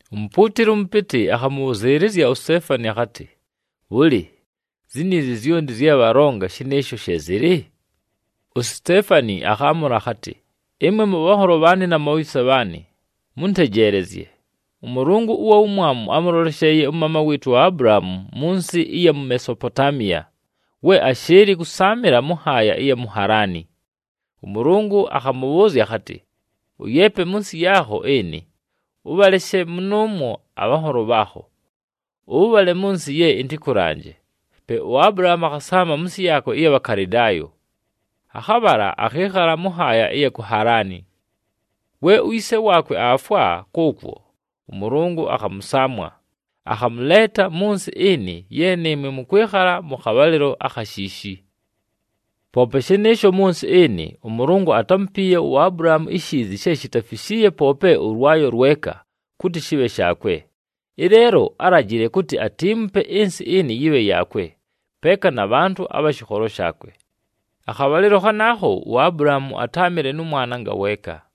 Umupuutili ʉmʉpɨtɨ akhamʉbhʉzɨɨlɨzya uSiteefani akhatɨ, “Bhʉlɨ, ziniizi zyonti zye bhalonga, shɨnɨɨsho she zɨlɨ?” USiteefani akhaamʉla akhatɨ, “Ɨmwe mʉbhanholo bhaanɨ na mubhayise bhaanɨ, mʉntejeelezye! ɄMʉlʉngʉ ʉwa Wumwamu ámʉlolesheeye ʉmaama wɨɨtʉ uAbulahaamu mʉ nsɨ ɨya mu Mesopotaamiya, we ashɨɨlɨ kʉsaamɨla mʉ nhaaya ɨya mu Halaani. ɄMʉlʉngʉ akhamʉbhʉʉzya akhatɨ, ‘Ʉyeepe mʉ nsɨ yaakho ɨnɨ, ʉbhaleshe mʉnʉʉmwo abhanholo bhaakho, ʉbhale mʉ nsɨ ye ɨntɨkʉlanje.’ Pe uAbulahaamu akhasaama mʉ nsɨ yaakwe ɨya Bhakalɨdaayo, akhabhala akhɨɨkhala mʉ nhaaya ɨya ku Halaani. We uyise waakwe aafwa kʉʉkwo, ʉMʉlʉngʉ akhamʉsaamwa, akhamʉleeta mʉ nsɨ ɨnɨ ye nɨɨmwe mʉkwɨkhala mʉ khabhalɨlo akha shiishi. “Poope shɨnɨɨsho, mʉ nsɨ ɨnɨ, ʉMʉlʉngʉ atámupiiye uAbulahaamu ishiizi she shitafishiiye poope ʉlwayo lweka kʉtɨ shɨbhe shaakwe. Ɨleelo álajile kʉtɨ atiimupe ɨnsɨ ɨnɨ yɨbhe yaakwe, peeka na bhantʉ abha shɨkholo shaakwe. Akhabhalɨlo khanaakho uAbulahaamu atáamɨle nʉ mwana ngaweeka.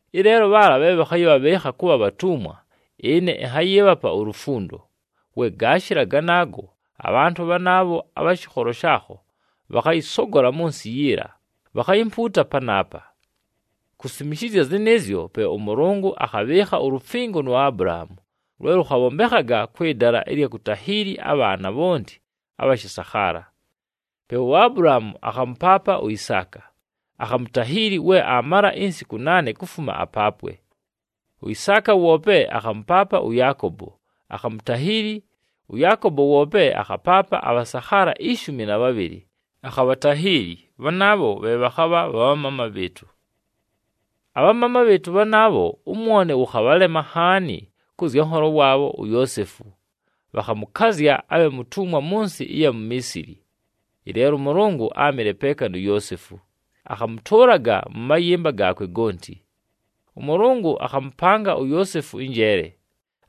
Ɨleelo bhaala bhe bhakhayɨbhabhɨɨkha kʉbha bhatumwa, ɨne ɨnhayɨɨbhapa ulufundo. We gaashɨla ganaago, abhantʉ bhanaabho abha shɨkholo shaakho bhakhayɨsogola mʉ nsɨ yiila, bhakhayimpuuta panaapa.’ Kusimishizya zɨnɨɨzyo, pe ʉMʉlʉngʉ akhabhɨɨkha ulufingo nu Abulahaamu, lwe lʉkhabhombekhaga kwɨ dala ɨlya kutahiili abhaana bhonti abha shɨsakhaala. Pe uAbulahaamu akhamʉpaapa uIsaaka, akhamutahiili we aamala insiku naane kufuma apaapwe. UIsaaka woope akhamʉpaapa ʉYaakobo, akhamutahiili, ʉYaakobo woope akhapaapa abhasakhaala ishumi na bhabhɨlɨ, akhabhatahiili, bhanaabho bhe bhakhabha bha bhamaama bhɨɨtʉ. “Abhamaama bhɨɨtʉ bhanaabho ʉmwone wʉkhabhalema nhaani kʉ zya nholo waabho uYoosefu, bhakhamʉkazya abhe mutumwa mʉ nsɨ ɨya mu Miisili. Ɨleelo ʉMʉlʉngʉ áamɨle peeka nu Yoosefu, akhamʉtʉʉlaga mʉ mayɨmba gaakwe gonti. ɄMʉlʉngʉ akhamʉpanga uYoosefu ɨnjeele,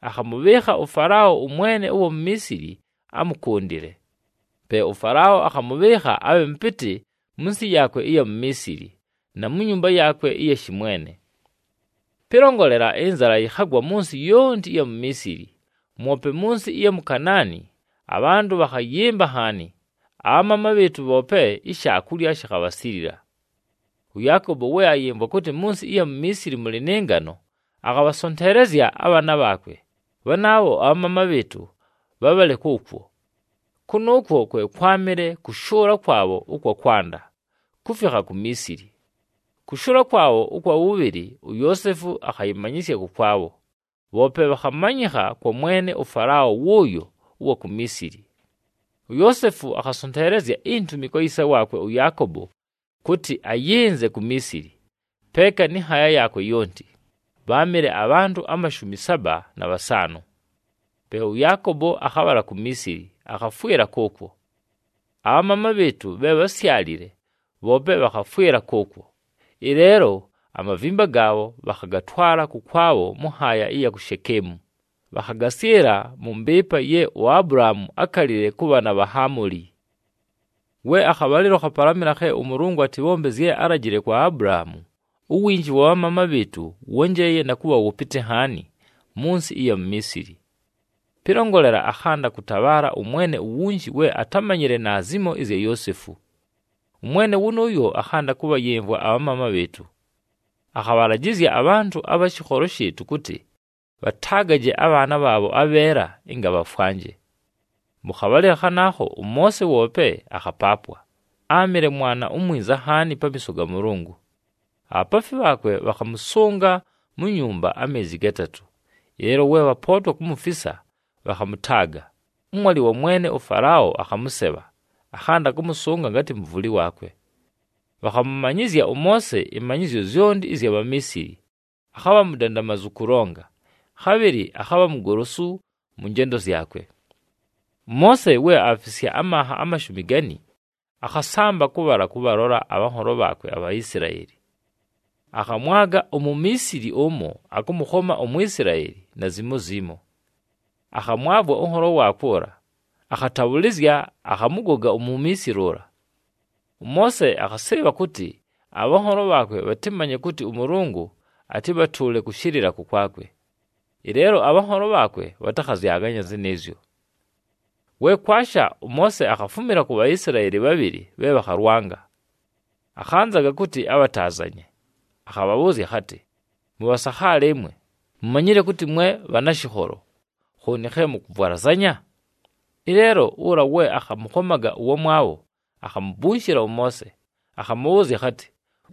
akhamʉbhɨɨkha ʉFalao ʉmwene ʉwa mu Miisili amʉkʉndɨle. Pe ʉFalao akhamʉbhɨɨkha abhe mʉpɨtɨ mʉ nsɨ yaakwe ɨya mu Miisili, na mu nyumba yaakwe ɨya shɨmwene. “Pɨlongolela, ɨnzala yɨkhagwa mʉ nsɨ yonti ɨya mu Miisili, mwope mʉ nsɨ ɨya mu Kanaani, abhantʉ bhakhayɨmba nhaani. Abhamaama bhɨɨtʉ bhoope ishaakulya shikhabhasilila. ɄYaakobo we ayɨmvwa kʉtɨ mʉ nsɨ ɨya mu Miisili mʉlɨ nɨ ngano, akhabhasonteelezya abhaana bhaakwe, bhanaabho abhamaama bhɨɨtʉ, bhabhale kʉʉkwo. Kʉnʉʉkwo kwe kwámɨle kʉshʉʉla kwabho ʉkwa kwanda, kufikha ku Miisili. Kʉshʉʉla kwabho ʉkwa wʉbhɨlɨ, uYoosefu akhayɨmanyɨsya kʉkwabho, bhoope bhakhamanyɨkha kwa mwene ʉFalao wʉʉyo ʉwa ku Miisili. UYoosefu akhasonteelezya intumi kwa yise waakwe ʉYaakobo kʉtɨ ayɨnze ku Miisili, peeka nɨ nhaaya yaakwe yonti, bháamɨle abhantʉ amashumi saba na bhasaanʉ. Pe ʉYaakobo akhabhala ku Miisili, akhafwɨla kʉʉkwo. Abhamaama bhɨɨtʉ bhe bhásyalile, bhoope bhakhafwɨla kʉʉkwo. Ɨleelo amavimba gaabho, bhakhatwala kʉkwabho mʉ nhaaya ɨya ku Shekeemu, bhakhagasyɨla mʉ mbɨɨpa ye uAbulahaamu ákalile kʉ bhaana bha Hamoli. “We akhabhalɨlo khapalamɨla khe ʉMʉlʉngʉ atɨbhombe zye álajile kwa Abulahaamu, uwinji wa bhamaama bhɨɨtʉ wónjeeye na kʉbha wʉpɨtɨ nhaani mʉ nsɨ ɨya mu Miisili. Pɨlongolela, akhanda kʉtabhaala ʉmwene uwunji we atámanyile naazimo ɨzya Yoosefu. Ʉmwene wʉnʉʉyo akhanda kʉbhayɨmvwa abhamaama bhɨɨtʉ. Akhabhalajɨzya abhantʉ abha shɨkholo shɨɨtʉ kʉtɨ bhataagaje abhaana bhaabho abheela, ɨnga bhafwanje. “Mʉ khabhalɨlo khanaakho ʉMoose woope akhapaapwa, áamɨle mwana umwinza nhaani pamiiso ga Mʉlʉngʉ. Abhapaafi bhaakwe bhakhamʉsʉnga mu nyumba ameezi gatatʉ. Ɨleelo we bhapootwa kumufisa, bhakhamʉtaaga, ʉmwalɨ wa mwene ʉFalao akhamʉsebha, akhanda kʉmʉsʉnga ngatɨ mʉvʉlɨ waakwe. Bhakhamʉmanyɨzya ʉMoose ɨmanyɨzyo zyonti ɨzya Bhamiisili, akhabha mudandamazu kʉlonga, khabhɨlɨ akhabha mugolosu mʉ njendo zyakwe. “ɄMoose we aafisya amanha amashumi gani, akhasamba kʉbhala kʉbhalola abhanholo bhaakwe aBhaisilaeli. Akhamwaga uMumiisili ʉmo akʉmʉkhoma uMwisilaeli naazimo zimo. Akhamwavwa ʉnholo waakwe ʉla, akhatabhʉlɨzya, akhamʉgoga uMumiisili ʉla. ɄMoose akhasɨɨbha kʉtɨ abhanholo bhaakwe bhatɨmanye kʉtɨ ʉMʉlʉngʉ atɨbhatʉʉle kʉshɨlɨla kʉkwakwe, ɨleelo abhanholo bhaakwe bhatakhazyaganya zɨnɨɨzyo. “We kwasha, ʉMoose akhafumila ku Bhaisilaeli bhabhɨlɨ bhe bhakhalwanga. Akhanzaga kʉtɨ abhataazanye, akhabhabhʉʉzya akhatɨ, ‘Mʉbhasakhaala ɨmwe, mumanyile kʉtɨ mwe bhanashɨkholo! Khooni khe mʉkʉvwalazanya?’ Ɨleelo ʉla we akhamʉkhomaga ʉwamwabho akhamubunshila ʉMoose, akhamʉbhʉʉzya akhatɨ,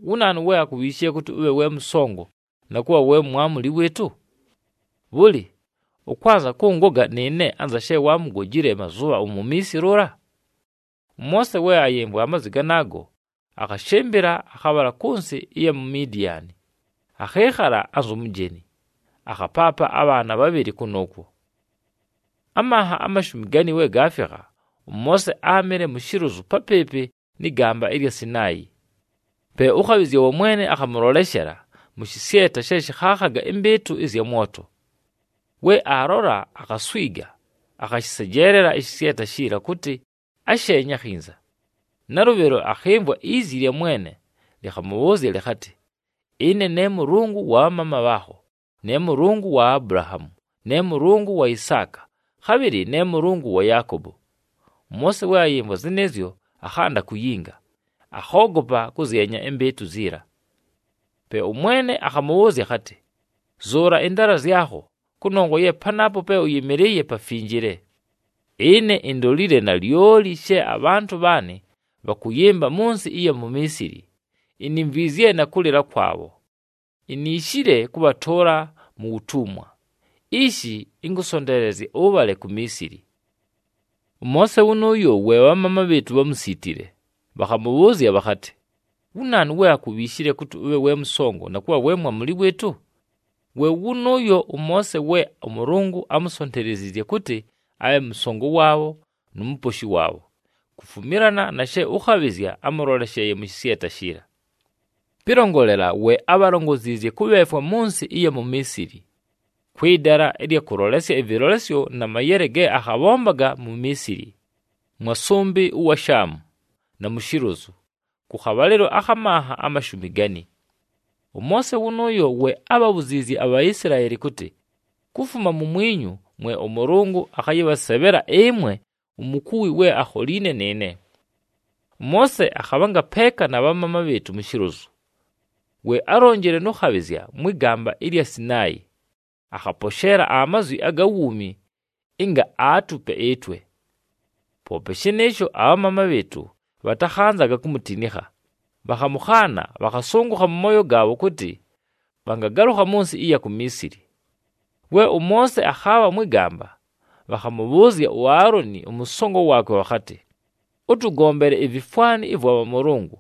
‘Wu naanu we akubhiishile kʉtɨ ʉbhe we mʉsongo, na kʉbha we mwamuli wɨɨtʉ? Bhʉlɨ, ʉkwanza kʉngoga nɨɨne anza she waamugojile mazʉbha uMumiisili ʉla?’ ɄMoose we ayɨmvwa amazwi ganaago, akhashɨmbɨla akhabhala kʉ nsɨ ɨya mu Midiani, akhɨɨkhala anzu mujeni, akhapaapa abhaana bhabhɨlɨ kʉnʉʉkwo. “Amanha amashumi gani we gaafikha, ʉMoose áamɨle mu shilozu papɨɨpɨ nɨ gamba ɨlya Sinaayi. Pe ʉkhabhɨzya wa Mwene akhamʉloleshela mʉ shɨsyeta she shɨkhaakhaga ɨmbɨɨtʉ ɨzya mwoto. We aalola, akhaswiga, akhashɨsejeelela ɨshɨsyeta shiila kʉtɨ asheenye akhinza. Nalʉbhɨlo akhɨmvwa izi lya Mwene, lɨkhamʉbhʉʉzya lɨkhatɨ, ‘Ɨne ne Mʉlʉngʉ wa bhamaama bhaakho, ne Mʉlʉngʉ wa Abulahaamu, ne Mʉlʉngʉ wa Isaaka, khabhɨlɨ ne Mʉlʉngʉ wa Yaakobo.’ ɄMoose we ayɨmvwa zɨnɨɨzyo, akhanda kuyinga, akhoogopa kʉzyenya ɨmbɨɨtʉ ziila. “Pe ʉMwene akhamʉbhʉʉzya akhatɨ, ‘Zʉʉla ɨndaala zyakho, kʉnongwa ye panaapo pe ʉyɨmɨlɨɨye pafinjile. Ɨne indolile nalyoli she abhantʉ bhaanɨ bhakʉyɨmba mʉ nsɨ ɨya mu Miisili, inimvwizye na kʉlɨla kwabho, iniishile kʉbhatʉʉla mu wutumwa. Ishi ɨnkʉsonteelezye ʉbhale ku Miisili.’ “ɄMoose wʉnʉʉyo we abhamaama bhɨɨtʉ bhámusiitile, bhakhamʉbhʉʉzya bhakhatɨ, ‘Wu naanu we akubhiishile kʉtɨ ʉbhe we mʉsongo, na kʉbha we mwamuli wɨɨtʉ?’ We wʉnʉʉyo ʉMoose we ʉMʉlʉngʉ ámusonteleziizye kʉtɨ abhe mʉsongo waabho nu muposhi waabho, kufumilana na she ʉkhabhɨzya ámʉlolesheeye mʉ shɨsyeta shiila. Pɨlongolela, we ábhalongoziizye kʉbheefwa mʉ nsɨ ɨya mu Miisili, kwɨ dala ɨlya kʉlolesya ɨvɨlolesyo na mayele ge akhabhombaga mu Miisili, mwa sʉmbɨ ʉwa Shaamu, na mu shilozu, kʉ khabhalɨlo akha manha amashumi gani. “ɄMoose wʉnʉʉyo we ábhabhuziizye aBhaisilaeli kʉtɨ, ‘Kufuma mumwinyu mwe ʉMʉlʉngʉ akhayɨbhasebhela ɨmwe umukuwi we akholiine nɨɨne.’ ɄMoose akhabhanga peeka na bhamaama bhɨɨtʉ mu shilozu. We álonjile nʉ khabhɨzya mwɨ gamba ɨlya Sinaayi, akhaposheela amazwi aga wuumi ɨnga aatupe ɨtwe. “Poope shɨnɨɨsho, abhamaama bhɨɨtʉ bhatakhanzaga kumutinikha, bhakhamʉkhaana, bhakhasʉngʉkha mʉ mooyo gaabho kʉtɨ bhangagalʉkha mʉ nsɨ ɨya ku Miisili. We ʉMoose akhaabha mwɨ gamba, bhakhamʉbhʉʉzya uAaloni ʉmʉsongo waakwe bhakhatɨ, ‘Ʉtʉgombele ivifwani ɨvwa bhamʉlʉngʉ,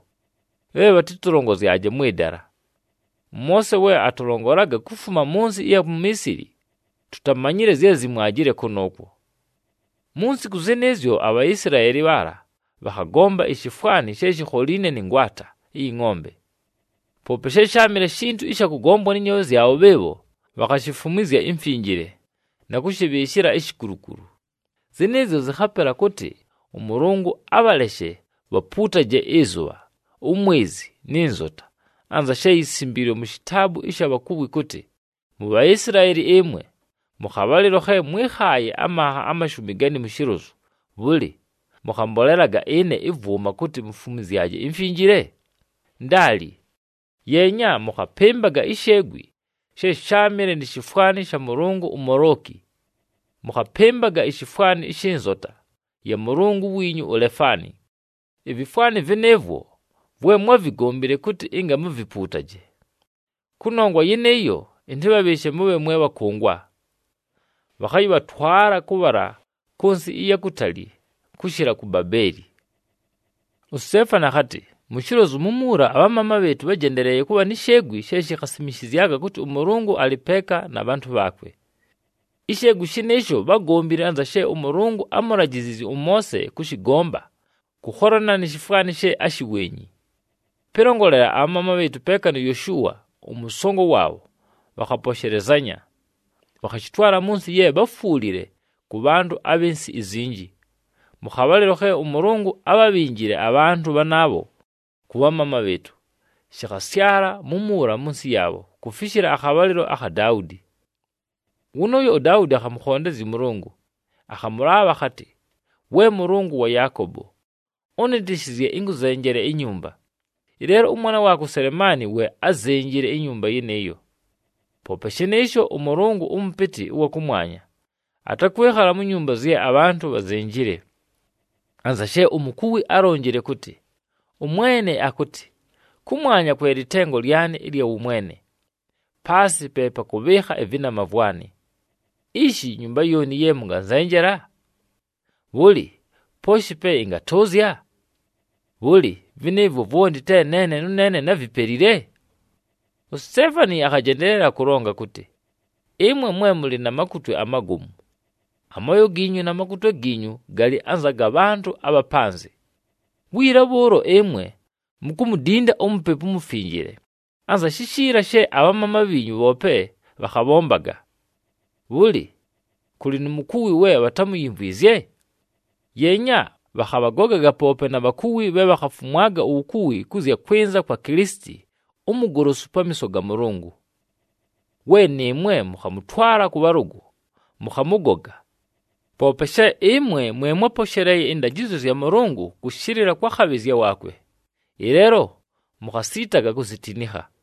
bhe bhatɨtʉlongozyaje mwɨ dala. ɄMoose we atʉlongolaga kufuma mʉ nsɨ ɨya mu Miisili, tutamanyile zye zimwajile kʉnʉʉkwo!’ Mu nsiku zɨnɨɨzyo aBhaisilaeli bhaala bhakhagomba ishifwani she shikholiine nɨ ngwata ɨyɨ ngʼombe. Poope she sháamɨle shintu ɨsha kʉgombwa nɨ nyoobhe zyabho bhɨɨbho, bhakhashifumwizya imfinjile, na kʉshɨbhɨɨshɨla ishikulukulu. Zɨnɨɨzyo zɨkhapela kʉtɨ ʉMʉlʉngʉ abhaleshe bhapuutaje ɨzʉbha, umwezi, nɨ nzota, anza she yisimbiilwe mu shitaabu ɨsha bhakuwi kʉtɨ, ‘MuBhaisilaeli ɨmwe, mʉ khabhalɨlo khe mwɨ́khaaye amanha amashumi gani mu shilozu, bhʉlɨ, mʉkhambolelaga ɨne ɨvwʉma kʉtɨ mumfumwizye imfinjile? Ndaali! Yeenya, mʉkhapɨmbaga isheegwi she sháamɨle ni shifwani sha mʉlʉngʉ uMolooki, mʉkhapɨmbaga ishifwani shɨ nzota ya mʉlʉngʉ wiinyu uLefani. Ivifwani vɨnɨɨvwo, vwe mwávigombile kʉtɨ ɨnga muvipuutaje. Kʉnongwa yɨnɨɨyo, ɨntɨbhabhɨɨshe mʉbhe mwe bhakʉngwa, bhakhayɨbhatwala kʉbhala kʉ nsɨ ɨya kutali kʉshɨla ku Babeeli.’” USiteefani akhatɨ, “Mu shilozu mumuula, abhamaama bhɨɨtʉ bhájendeleeye kʉbha ni sheegwi she shikhasimishizyaga kʉtɨ ʉMʉlʉngʉ alɨ peeka na bhantʉ bhaakwe. Isheegwi shɨnɨɨsho bhágombile anza she ʉMʉlʉngʉ ámulajiziizye ʉMoose kʉshɨgomba kʉkholana ni shifwani she áshiwenyi. Pɨlongolela, abhamaama bhɨɨtʉ peeka nu Yoshua, ʉmʉsongo waabho, bhakhaposhelezanya, bhakhashɨtwala mʉ nsɨ ye bháfwulile kʉ bhantʉ abhɨ nsɨ izinji, mʉ khabhalɨlo khe ʉMʉlʉngʉ ábhabhinjile abhantʉ bhanaabho kʉ bhamaama bhɨɨtʉ. Shɨkhasyala mumuula mʉ nsɨ yaabho kufishila akhabhalɨlo akha Daudi. “Wʉnʉʉyo uDaudi akhamʉkhondezya ʉMʉlʉngʉ, akhamʉlaabha akhatɨ, ‘We Mʉlʉngʉ wa Yaakobo, ʉnɨtɨshɨzye ɨnkʉzenjele inyumba.’ Ɨleelo ʉmwana waakwe uSelemaani we ázenjile inyumba yɨnɨɨyo. Poope shɨnɨɨsho, ʉMʉlʉngʉ ʉMʉpɨtɨ ʉwa kʉmwanya, atakwɨkhala mu nyumba zye abhantʉ bhazenjile. Anza she umukuwi álonjile kʉtɨ, ‘ɄMwene akʉtɨ, “Kʉmwanya kwe lɨtengo lyanɨ ɨlya wʉmwene, paasɨ pe pakʉbhɨɨkha ɨvɨnama vwanɨ. Ishi, nyumba yooni ye mʉnganzenjela? Bhʉlɨ, pooshi pe ɨngatʉʉzya? Bhʉlɨ, vɨnɨɨvwo vwonti te neene nʉneene návipelile?”’” USiteefani akhajendeelela kʉlonga kʉtɨ, “Ɨmwe mwe mʉlɨ na matwe amagomu! Amooyo giinyu na makutwe giinyu galɨ anza ga bhantʉ abha panzɨ. Wiila bhʉʉlo ɨmwe mukumudinda uMupepu uMufinjile anza shishiila she abhamaama bhiinyu bhoope bhakhabhombaga! Bhʉlɨ, kʉlɨ nu mukuwi we bhatámuyimvwizye? Yeenya, bhakhabhagogaga poope na bhakuwi bhe bhakhafumwaga uwukuwi kʉ zya kwɨnza kwa Kilisiti uMugolosu pamiiso ga Mʉlʉngʉ! We nɨɨmwe mʉkhamʉtwala kʉ bhalʉgʉ, mʉkhamʉgoga. Poope she ɨmwe mwe mwáposheleeye ɨndajɨzyo zya Mʉlʉngʉ kʉshɨlɨla kwa khabhɨzya waakwe, ɨleelo mukhasiitaga kuzitinikha.”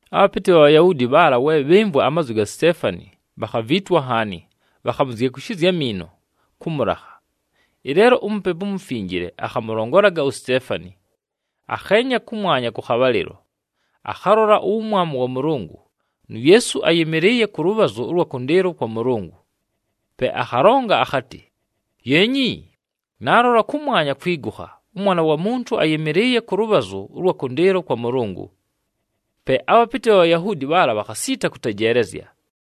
Abhapɨtɨ bha Bhayahuudi bhaala we bhɨmvwa amazwi ga Siteefani, bhakhaviitwa nhaani, bhakhamuzyekushizya amiino kʉ mʉlakha. Ɨleelo uMupepu uMufinjile akhamʉlongolaga uSiteefani. Akheenya kʉmwanya kʉ khabhalɨlo, akhalola uwumwamu wa Mʉlʉngʉ, nu Yeesu ayɨmɨlɨɨye kʉlʉbhazʉ ʉlwa kʉndɨɨlo kwa Mʉlʉngʉ. Pe akhalonga akhatɨ, “Yeenyi! Naalola kʉmwanya kwigukha, ʉMwana wa Muntu ayɨmɨlɨɨye kʉlʉbhazʉ ʉlwa kʉndɨɨlo kwa Mʉlʉngʉ!” Pe abhapɨtɨ bha Bhayahuudi bhaala bhakhasiita kʉtejeelezya,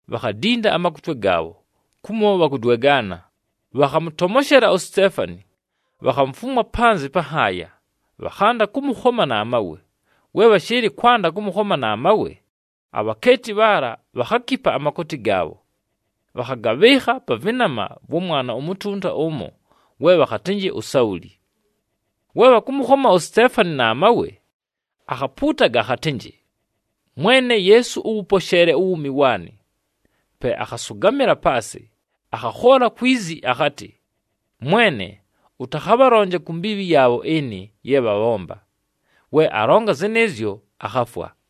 bhakhadinda amakutwe gaabho, kumo bhakudwegaana, bhakhamʉtomoshela uSiteefani, bhakhamufumwa panzɨ pa nhaaya, bhakhanda kʉmʉkhoma na mawe. We bhashɨɨlɨ kwanda kʉmʉkhoma na mawe, abhakeeti bhaala bhakhakipa amakooti gaabho, bhakhagabhɨɨkha pa vɨnama vwa mwana umutunta ʉmo, we bhakhatɨnjɨ uSauli. We bhakʉmʉkhoma uSiteefani na mawe, akhapuutaga akhatɨnjɨ, “Mwene Yeesu, ʉwʉposheele uwuumi waanɨ!” Pe akhasʉgamɨla paasɨ, akhakhoola kwi zi akhatɨ, “Mwene, ʉtakhabhalonje ku mbiibhi yaabho ɨnɨ ye bhabhomba.” We alonga zɨnɨɨzyo, akhafwa.